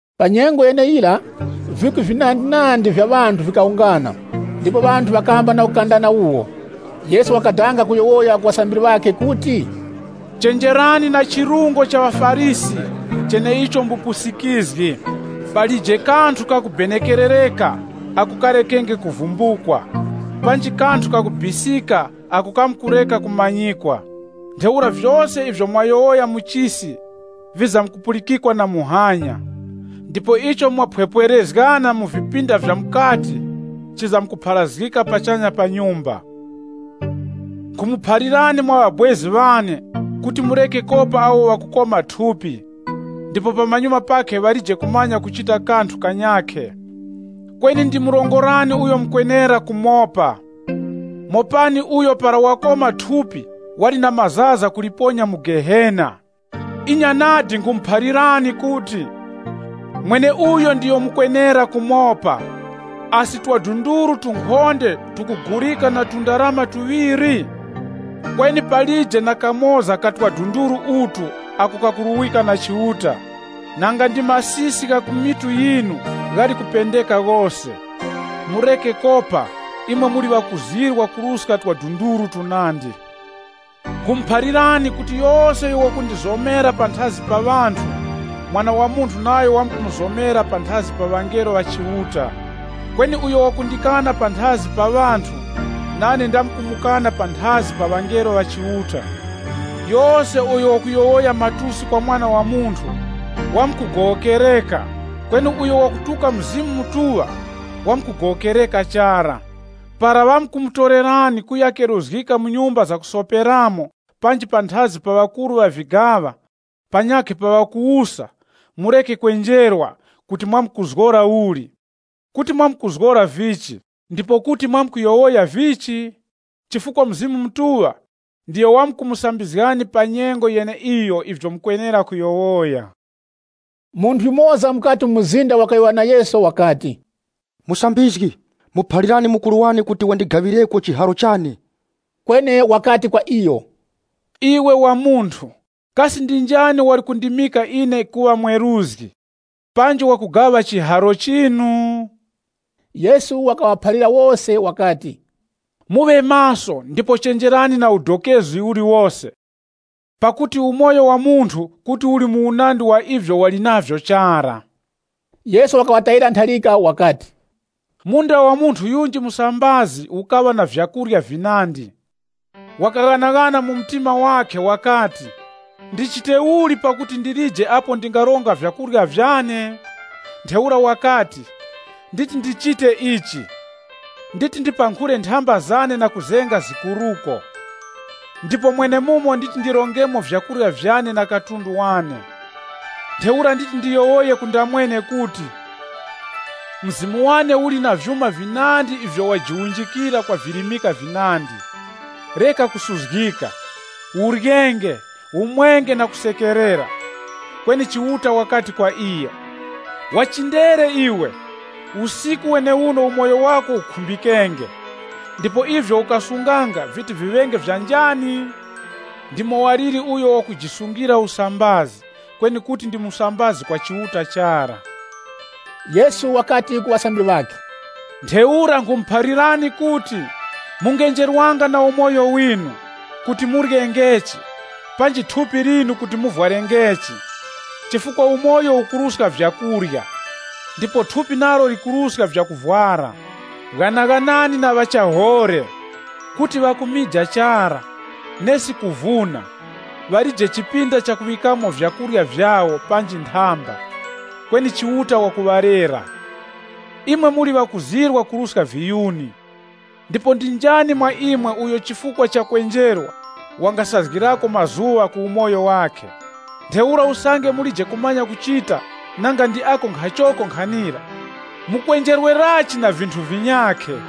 Pa nyengo yeneyira, vikwi vinandinandi vya ŵanthu vikawungana, mwakuti ŵanthu ŵakakandananga waka. Yesu wakadanga kuyowoya ku ŵasambiri ŵakhe kuti, “Chenjerani na chirungo cha ŵaFarisi cheneicho mbupusikizgi. Palije kanthu kakubenekerereka ako karekenge kuvumbukwa, panji kanthu kakubisika ako kamkureka kumanyikwa. Ntheura vyose ivyo mwayowoya mu chisi, vizamkupulikikwa na muhanya, ndipo icho mwaphwepwerezgana mu vipinda vya mukati, chizamkupharazgika pachanya pa nyumba.” “Nkhumuphalirani mwa ŵabwezi ŵane kuti mureke kopa awo ŵakukoma thupi, ndipo pamanyuma pakhe ŵalije kumanya kuchita kanthu kanyakhe. Kweni ndimurongorani uyo mukwenera kumopa. Mopani uyo para wakoma thupi wali na mazaza kuliponya mu Gehena Inya nadi nkhumuphalirani kuti, mweneuyo ndiyo mukwenera kumopa. “Asi twadunduru tunkhonde tukugulika na tundarama tuŵiri? Kweni palije na kamoza ka twadunduru utu ako kakuruwika na Chiuta. Nanga ndi masisi gha mitu yinu ghali kupendeka ghose. Mureke kopa, imwe muli ŵakuzirwa kuruska twadunduru tunandi.” “Nkhumuphalirani kuti yose uyo wakundizomera panthazi pa ŵanthu, Mwana wa Munthu nayo wamkumuzomera panthazi pa ŵangelo ŵa Chiuta. Kweni uyo wakundikana panthazi pa ŵanthu, nane ndamkumukana panthazi pa ŵangelo ŵa Chiuta. “Yose uyo wakuyowoya matusi kwa Mwana wa Munthu, wamkugowokereka kweni uyo wakutuka Mzimu Mutuŵa, wamkugowokereka chara. “Para ŵamkumutorerani kuya keruzgika mu nyumba zakusoperamo panji panthazi pa ŵakuru ŵa vigaŵa, panyakhe pa ŵakuwusa, mureke kwenjerwa kuti mwamkuzgora uli, kuti mwamkuzgora vichi, ndipo kuti mwamkuyowoya vichi? Chifukwa Mzimu Mutuŵa ndiyo wamkumusambizgani pa nyengo yeneiyo ivyo mukwenera kuyowoya.” Munthu yumoza mukati mu mzinda wakayowoya na Yesu wakati, “Musambizgi, muphalirani mukuru wane kuti wandigaŵireko chiharo chane.” Kweni wakati kwa iyo, “Iwe wa munthu, kasi ndi njani wali kundimika ine kuŵa mweruzgi, panji wakugaŵa chiharo chinu?” Yesu wakaŵaphalira wose wakati, “Muŵe maso ndipo chenjerani na udokezi uliwose, pakuti umoyo wa munthu kuti uli mu unandi wa ivyo wali navyo chara.” Yesu wakaŵatayira ntharika wakati, “Munda wa munthu yunji musambazi ukaŵa na vyakurya vinandi. Wakaghanaghana mu mtima wakhe wakati, ‘Ndichite uli pakuti ndilije apo ndingaronga vyakurya vyane?’ Ntheura wakati, ‘Nditi ndichite ichi. Nditi ndipankhule nthamba zane na kuzenga zikuruko. Ndipo mwenemumo nditi ndirongemo vyakurya vyane na katundu wane. Ntheura nditi ndiyowoye ku ndamwene kuti, mzimu wane uli na vyuma vinandi ivyo wajiwunjikira kwa virimika vinandi. Sono ufwasenge, uryenge, umwenge na kusekerera.’ Kweni Chiuta wakati kwa iyo, ‘Wa chindere iwe! Usiku wenewuno umoyo wako ukhumbikenge, ndipo ivyo ukasunganga viti viŵenge vya njani?’ “Ndimo waliri uyo wakujisungira usambazi, kweni kuti ndi musambazi kwa Chiuta chara.” Yesu wakati ku ŵasambiri ŵakhe, Ntheura nkhumuphalirani kuti, mungenjerwanga na umoyo winu, kuti muryengechi, panji thupi linu kuti muvwarengechi. Chifukwa umoyo ukuruska vyakurya, ndipo thupi nalo likuruska vyakuvwara. Ghanaghanani na ŵachihoŵe, kuti ŵakumija chara, nesi kuvuna. Iwo ŵalije chipinda chakuŵikamo vyakurya vyawo panji nthamba, kweni Chiuta wakuŵalera. Imwe muli ŵakuzirwa kwakuruska viyuni! Ndipo ndi njani mwa imwe uyo chifukwa cha kwenjerwa, wangasazgirako mazuŵa ku umoyo wakhe? Ntheura usange mulije kumanya kuchita nanga ndi ako nkhachoko nkhanira, mukwenjerwerachi na vinthu vinyakhe?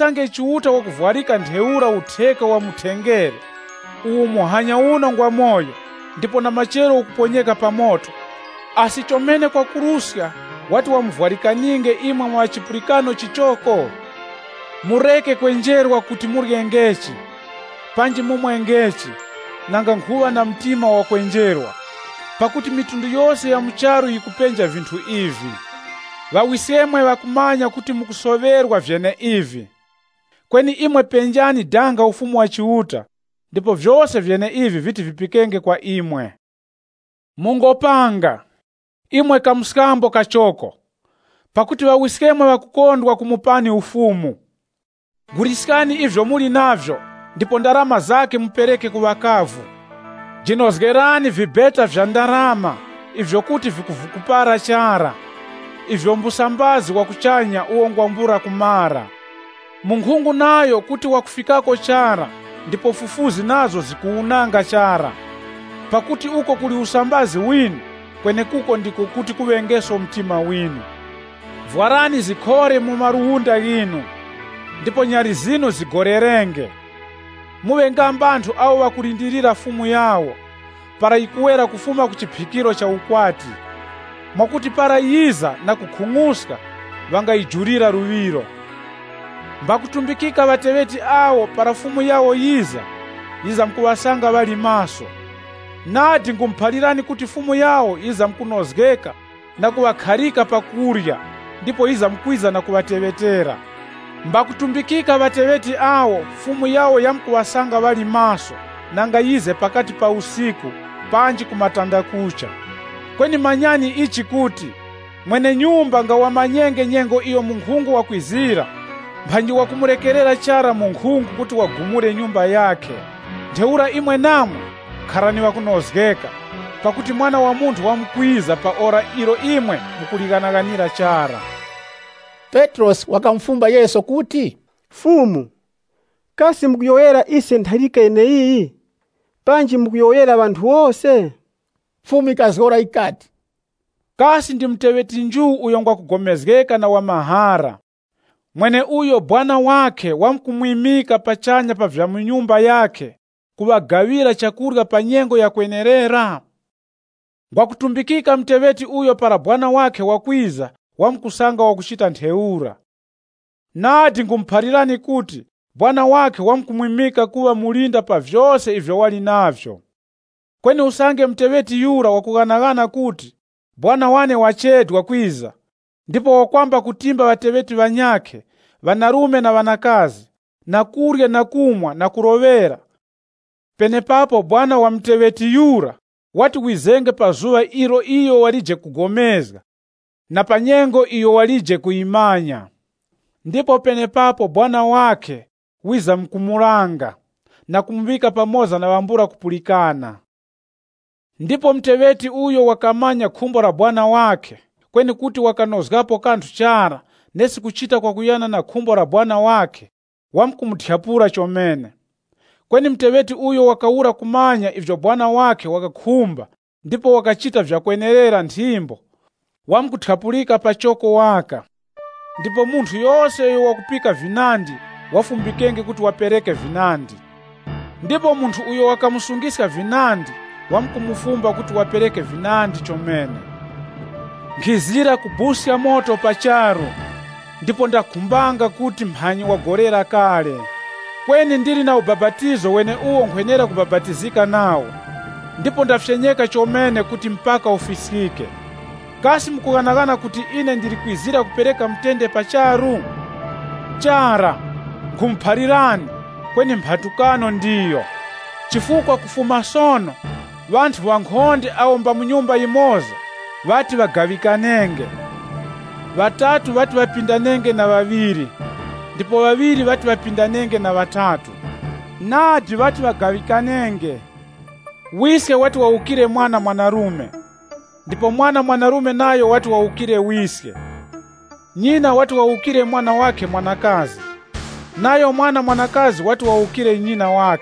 Kweni usange Chiuta wakuvwarika ntheura utheka wa mu thengere, uwo muhanya uno ngwamoyo ndipo na machero ukuponyeka pa moto, asi chomene kwakuruska wati wamuvwarikaninge imwe mwa ŵa chipulikano chichoko! “Mureke kwenjerwa kuti muryengechi, panji mumwengechi, nanga nkhuŵa na mtima wakwenjerwa. Pakuti mafuko ghose gha mu charu ghakupenja vinthu ivi. Ŵawiskemwe ŵakumanya kuti mukusoŵerwa vyeneivi. Kweni imwe penjani danga Ufumu wa Chiuta ndipo vyose vyeneivi viti vipikenge kwa imwe. “Mungopanga, imwe kamskambo kachoko. Pakuti Ŵawiskemwe ŵakukondwa kumupani Ufumu. Guliskani ivyo muli navyo ndipo ndarama zakhe mupereke ku ŵakavu. Jinozgerani vibeta vya ndarama ivyo kuti vikuvukupara chara, ivyo mbusambazi wa kuchanya uwo ngwambula kumara. Munkhungu nayo kuti wakufikako chara ndipo fufuzi nazo zikuwunanga chara. Pakuti uko kuli usambazi winu, kwenekuko ndiko kuti kuŵengeso mtima winu. “Vwarani zikhore mu maluwunda ghinu, ndipo nyali zinu zigolerenge. Muŵe nga mbanthu awo ŵakulindirira sekuru wawo, para wakuwera kufuma ku chiphikiro cha nthengwa, mwakuti para iyo wiza na kukhung'uska, ŵangamanya kumujulira luŵiro. Mbakutumbikika ŵateŵeti awo para sekuru wawo wiza, wizamkuŵasanga ŵali maso. Nadi nkhumuphalirani kuti sekuru wawo wizamkunozgeka na kuŵakharika pa kurya ndipo wamkwiza na kuŵateŵetera. Mbakutumbikika ŵateŵeti awo sekuru wawo wamkuŵasanga ŵali maso nanga wize pakati pa usiku panji ku matandakucha. Kweni manyani ichi kuti, mwene-nyumba nga wamanyenge nyengo iyo munkhungu wakwizira, mphanyi wakumurekerera chara munkhungu kuti wagumure nyumba yakhe. Ntheura imwe namwe, kharani ŵakunozgeka, pakuti Mwana wa Munthu wamkwiza pa ora ilo imwe mukulighanaghanira chara.” Petrosi wakamufumba Yesu kuti, “Fumu, kasi mukuyowoyera ise ntharika yeneiyi, panji mukuyowoyera ŵanthu wose?” Fumu yikazgora yikati, “Kasi ndi muteŵeti nju uyo ngwa kugomezgeka na wa mahara, mweneuyo sekuru wakhe wamkumwimika pachanya pa vya nyumba yakhe, kuŵagaŵira chakurya pa nyengo ya kwenerera? Ngwakutumbikika muteŵeti uyo para sekuru wakhe wakwiza wamkusanga wakuchita ntheura. Nadi nkhumuphalirani kuti, sekuru wakhe wamkumwimika kuŵa mulinda pa vyose ivyo wali navyo. Kweni usange muteŵeti yura wakughanaghana kuti, ‘Sekuru wane wachedwa kwiza,’ ndipo wakwamba kutimba ŵateŵeti ŵanyakhe ŵanarume na ŵanakazi, na kurya na kumwa na kuloŵera, penepapo sekuru wa muteŵeti yura, wati wizenge pa zuŵa ilo iyo walije kugomezga, na pa nyengo iyo walije kuyimanya. Ndipo penepapo sekuru wakhe wizamkumulanga na kumuŵika pamoza na ŵambula kupulikana. “Ndipo muteŵeti uyo wakamanya khumbo la mwene-nchito wakhe, kweni kuti wakanozgapo kanthu chara nesi kuchita kwakuyana na khumbo la mwene-nchito wakhe, wamkuthyapulika chomene. Kweni muteŵeti uyo wakawura kumanya ivyo mwene-nchito wakhe wakukhumba ndipo wakachita vyakwenerera nthimbo, wamkuthyapulika pachoko waka. Ndipo munthu yose uyo wakupika vinandi wafumbikenge kuti wapereke vinandi. Ndipo munthu uyo ŵakamusungiska vinandi, ŵamkumufumba kuti wapereke vinandi chomene. “Nkhizira kuponya moto pa charu, ndipo ndakhumbanga kuti mphanyi wagolera kale! Kweni ndili na ubapatizo weneuwo nkhwenera kubapatizika nawo, ndipo ndafyenyeka chomene kuti mpaka ufiskike. Kasi mukughanaghana kuti ine ndili kwizira kupereka mutende pa charu? Chara, nkhumuphalirani, kweni mphatukano ndiyo. Chifukwa kufuma sono, ŵanthu ŵankhonde awo mba mu nyumba yimoza ŵati ŵagaŵikanenge. Ŵatatu ŵati ŵapindanenge na ŵaŵiri, ndipo ŵaŵiri ŵati ŵapindanenge na ŵatatu. Nadi ŵati ŵagaŵikanenge. Wiske wati wawukire mwana mwanarume, ndipo mwana mwanarume nayo wati wawukire wiske. Nyina wati wawukire mwana wakhe mwanakazi, nayo mwana mwanakazi wati wawukire nyina.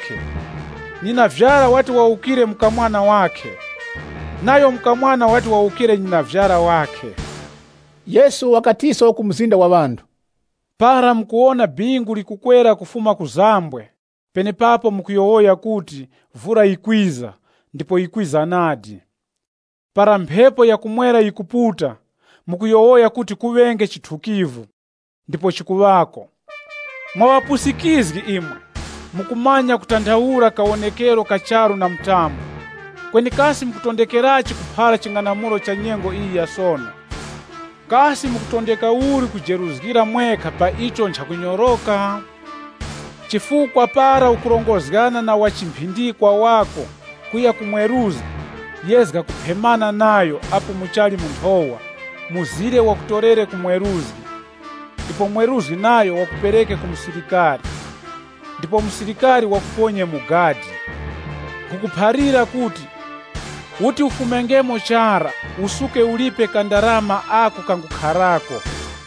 Nyinavyara wati wawukire mukamwana wakhe, nayo mukamwana wati wawukire nyinavyara wakhe.” Yesu wakatiso ku mzinda wa ŵanthu, Para mukuwona bingu likukwera kufuma ku manjiliro gha dazi, mukuyowoya penepapo kuti, vura yikwiza ndipo yikwiza nadi. Para mphepo ya ku mwera yikuputa, mukuyowoya kuti kuŵenge chithukivu, ndipo chikuŵako. Mwa ŵapusikizgi imwe! Mukumanya kutanthaula kawonekero ka charu na mtambo. Kweni kasi mukutondekerachi kuphara ching'anamulo cha nyengo iyi ya sono. “Kasi mukutondeka uli kujeruzgira mwekha pa icho nchakunyoroka? Chifukwa para ukurongozgana na wa chimphindikwa wako kuya ku mweruzgi, yezga kuphemana nayo apo muchali mu nthowa mzire wakutorere ku mweruzgi, ndipo mweruzgi nayo wakupereke ku musilikari, ndipo musilikari wakuponye mu gadi. Nkhukuphalira kuti, uti ufumengemo chara usuke ulipe kandarama ako kangukharako.”